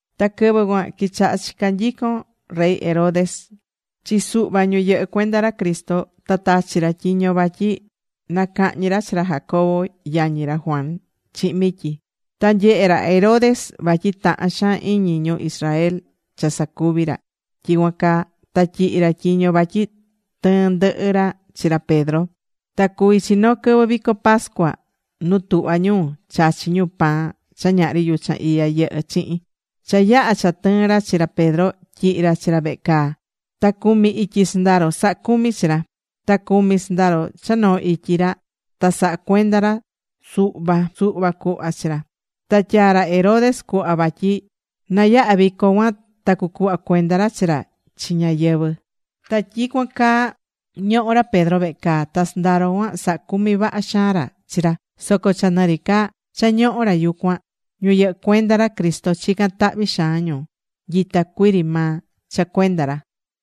Ta quɨvɨ cuan quichaha̱ chica nyicon rey Herodes chi suhva ñu yɨhɨ́ cuenda ra Cristo. Ta tachi̱ ra tyiño vatyi na cahñi ra chi ra Jacobo yañi ra Juan chihin mityi. Ta nyehe ra Herodes vatyi tahan xaan iñi ñu Israel cha sacuvi̱ ra tyicuan caa, ta tyihi̱ ra tyiño vatyi tɨɨn ndɨhɨ ra chi ra Pedro. Ta cuví chi noo quɨvɨ vico pascua nu tuhva ñu chachi ñu pan cha ñahri yuchan iya yɨhɨ chihin. Cha yaha̱ cha tɨɨ̱n ra chi ra Pedro, tyihi̱ ra chi ra vehe caa. Ta cumi ityi sɨndaro sahá cumi chi ra. Ta cumi sɨndaro cha noo ityi ra ta sahá cuenda ra suhva suhva cuhva chi ra. Ta tyaa̱ ra Herodes cuhva vatyi nayahá vico cuan ta cucuhva cuenda ra chi ra chi ñáyɨvɨ. Ta tyicuan caa ñohó ra Pedro vehe caa. Ta sɨndaro cuan sahá cumi vaha xaan ra chi ra. Soco cha nɨ ri ca cha ñohó ra yucuan, ñu yɨhɨ́ cuenda ra Cristo chicán tahvi xaan ñu nyita cuii ri maa cha cuenda ra.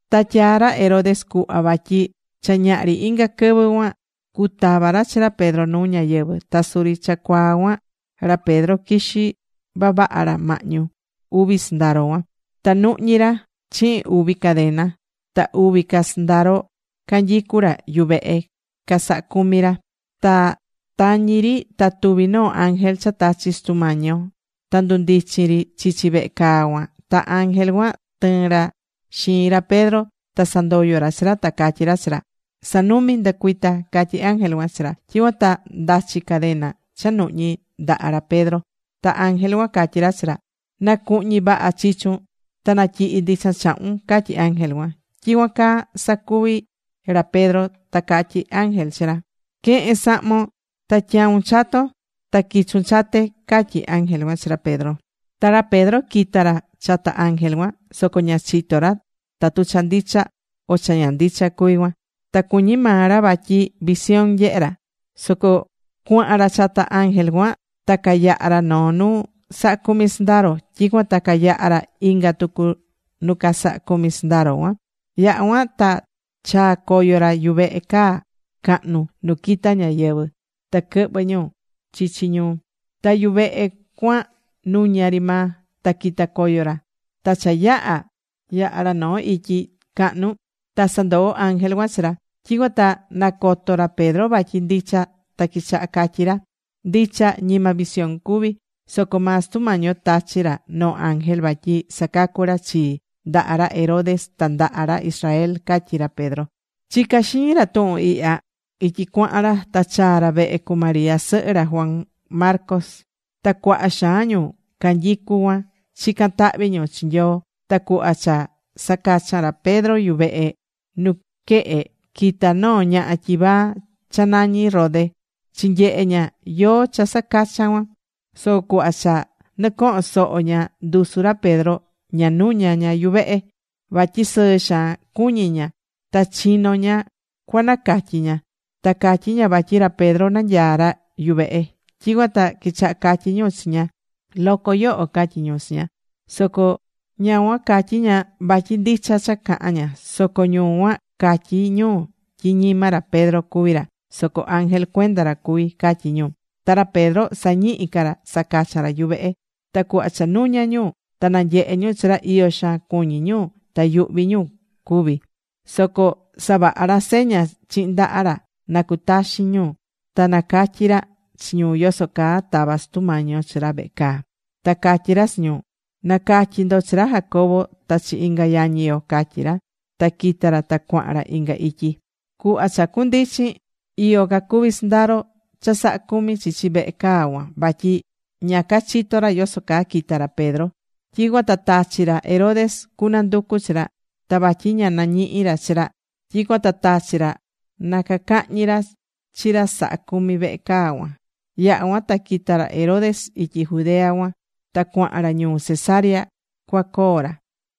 Ta tyaá ra Herodes cuhva vatyi cha ñaha ri inga quɨvɨ cuan cutava ra chi ra Pedro nuu ñáyɨvɨ. Ta suri cha cuaa cuan ra Pedro quixí vavaha ra mahñu uvi sɨndaro cuan. Ta nuhñí ra chihin uvi cadena. Ta uvi ca sɨndaro canyicú ra yuvehe casahá cumi ra. Ta tañi ri ta tuvi̱ noo ángel cha tachi̱ Sutu Mañi yo. Ta ndundichin ri chichi vehe caa cuan. Ta ángel cuan tɨɨ̱n ra xiin ra Pedro. Ta sandoyo̱ ra chi ra. Ta catyí ra chi ra: ―Sa̱numi. Ndɨ̱cuita ―catyi ángel cuan chi ra. Tyicuan ta ndachi̱ cadena cha nuhñi ndaha ra Pedro. Ta ángel cuan catyí ra chi ra: ―Na̱cuhñi vaha chichun ta na̱tyihi ndichan chahun ―catyí ángel cuan. Tyicuan caa sacuvi̱ ra Pedro. Ta catyí ángel chi ra: ―Que̱hen sahmon ta tya̱un chaton ta qui̱chun chate ―catyí ángel cuan chi ra Pedro. Ta ra Pedro quita̱ ra chata ángel cuan. Soco ña chitó ra tatu cha ndicha o cha ña ndicha cuví cuan, ta cuñi maa ra vatyi visión nyehé ra. Soco cuahan ra chata ángel cuan ta cayaha̱ ra noo nu sahá cumi sɨndaro. Tyicuan ta cayaha̱ ra inga tucu nu casahá cumi sɨndaro cuan. Yaha̱ cuan ta chaa̱ coyo ra yuvehe caa cahnu nu quita ñáyɨvɨ ta quɨhvɨ ñu chichi ñuu. Ta yuvehe cuan nuña ri maa. Ta quita̱ coyo ra. Ta cha yaha̱ yaha ra noo ityi cahnu, ta sandoo̱ ángel cuan chi ra. Tyicuan ta nacoto̱ ra Pedro vatyi ndicha ta quichaha catyi ra: ―Ndicha, ñima visión cuvi. Soco maa Sutu Mañi yo tachi̱ ra noo ángel vatyi sacacu̱ ra chii ndaha ra Herodes ta ndaha ra Israel ―catyí ra Pedro. Chicá xiñi ra tuhun ihya ityi cuahan ra. Ta chaa̱ ra vehe cu María sɨhɨ ra Juan Marcos. Ta cuaha xaan ñu canyicú cuan chicán tahvi ñu chi Nyoo. Ta cuhva cha sacacha̱n ra Pedro yuvehe nuquehe, quita̱ noo ñaha tyivaa cha nañí Rode chinyehe ña yóó cha sacachan cuan. Soco cuhva cha nɨcohon soho ña ndusu ra Pedro, ña nuña̱ ña yuvehe. Vatyi sɨɨ xaan cuñí ña, ta chino ña cua nacatyi ña. Ta catyí ña vatyi ra Pedro nanyaá ra yuvehe. Tyicuan ta quichaha catyí ñu chi ña: ―Loco yoho ―catyí ñu chi ña. Soco ña cuan catyí ña vatyi ndicha cha cahán ña. Soco ñu cuan catyí ñu tyi ñima ra Pedro cuví ra, soco ángel cuenda ra cuví, catyí ñu. Ta ra Pedro sañihí ca ra sacachan ra yuvehe. Ta cuhva cha nuña̱ ñu ta nanyehe̱ ñu chi ra, iyo xaan cuñi̱ ñu ta yuhvi̱ ñu cuvi̱. Soco savaha̱ ra seña chihin ndaha ra nacutaxin ñu. Ta nacatyi̱ ra chi ñu yoso caa tava̱ Sutu Mañi yo chi ra vehe caa. Ta catyí ra chi ñu: ―Na̱catyi ndo chi ra Jacobo ta chi inga yañi yo ―catyí ra. Ta quita̱ ra ta cuahan ra inga ityi. Cuhva cha cundichin, iyo cacuvi sɨndaro cha sahá cumi chichi vehe caa cuan, vatyi ña cachitó ra yoso caa quita̱ ra Pedro. Tyicuan ta tachi̱ ra Herodes cunanducu chi ra. Ta vatyi ña nañihi̱ ra chi ra, tyicuan ta tachi̱ ra na cacahñi ra chi ra sahá cumi vehe caa cuan. Yaha̱ cuan ta quita̱ ra Herodes ityi Judea cuan ta cuahan ra ñuu Cesarea cuacoo ra.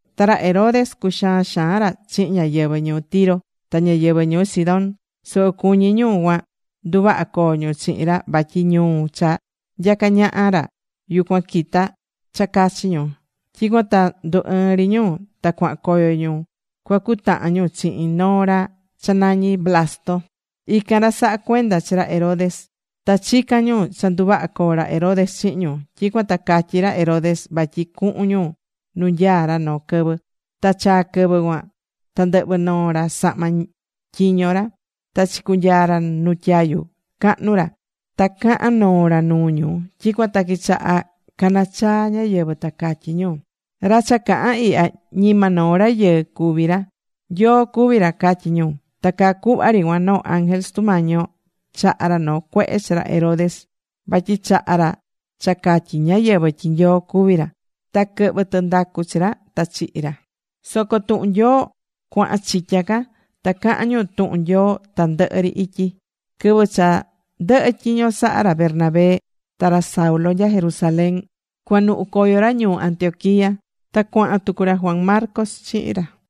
Ta ra Herodes cuxaan xaan ra chihin ñáyɨvɨ ñuu Tiro ta ñáyɨvɨ ñuu Sidón. Soco cuñí ñu cuan nduvaha coo ñu chihin ra vatyi ñuu cha nyacá ñaha ra yucuan quitá cha cachi ñu. Tyicuan ta ndu ɨɨ̱n ri ñu ta cuahan coyo ñu cuacutahan ñu chihin noo ra cha nañí Blasto. Ican ra sahá cuenda chi ra Herodes. Ta chicán ñu cha nduvaha coo ra Herodes chihin ñu. Tyicuan ta catyí ra Herodes vatyi cuhun ñu nu nyaá ra noo quɨvɨ. Ta chaa̱ quɨvɨ cuan ta ndɨhvɨ̱ noo ra sahma tyiño ra. Ta chicunyaa ra nu tyayu cahnu ra. Ta caha̱n noo ra nuu ñu. Tyicuan ta quichaha canachaa̱ ñáyɨvɨ, ta catyí ñu: ―Ra cha cahán ihya ñima noo rayɨɨ ri cuví ra. Nyoo cuví ra ―catyí ñu. Ta caa cuhva ri cuan noo ángel Sutu Mañi yo chaha̱ ra noo cuehe chi ra Herodes vatyi chaha̱ ra cha catyi̱ ñáyɨvɨ tyi Nyoo cuví ra. Ta quɨhvɨ̱ tɨndacu chi ra, ta chihi̱ ra. Soco tuhun Nyoo cuahan chitya ca. Ta caha̱n ñu tuhun Nyoo tandɨhɨ ri ityi. Quɨvɨ cha ndɨhɨ̱ tyiño saha ra Bernabé ta ra Saulo nya Jerusalén, cuanuhu coyo ra ñuu Antioquia. Ta cuahan tucu ra Juan Marcos chihin ra.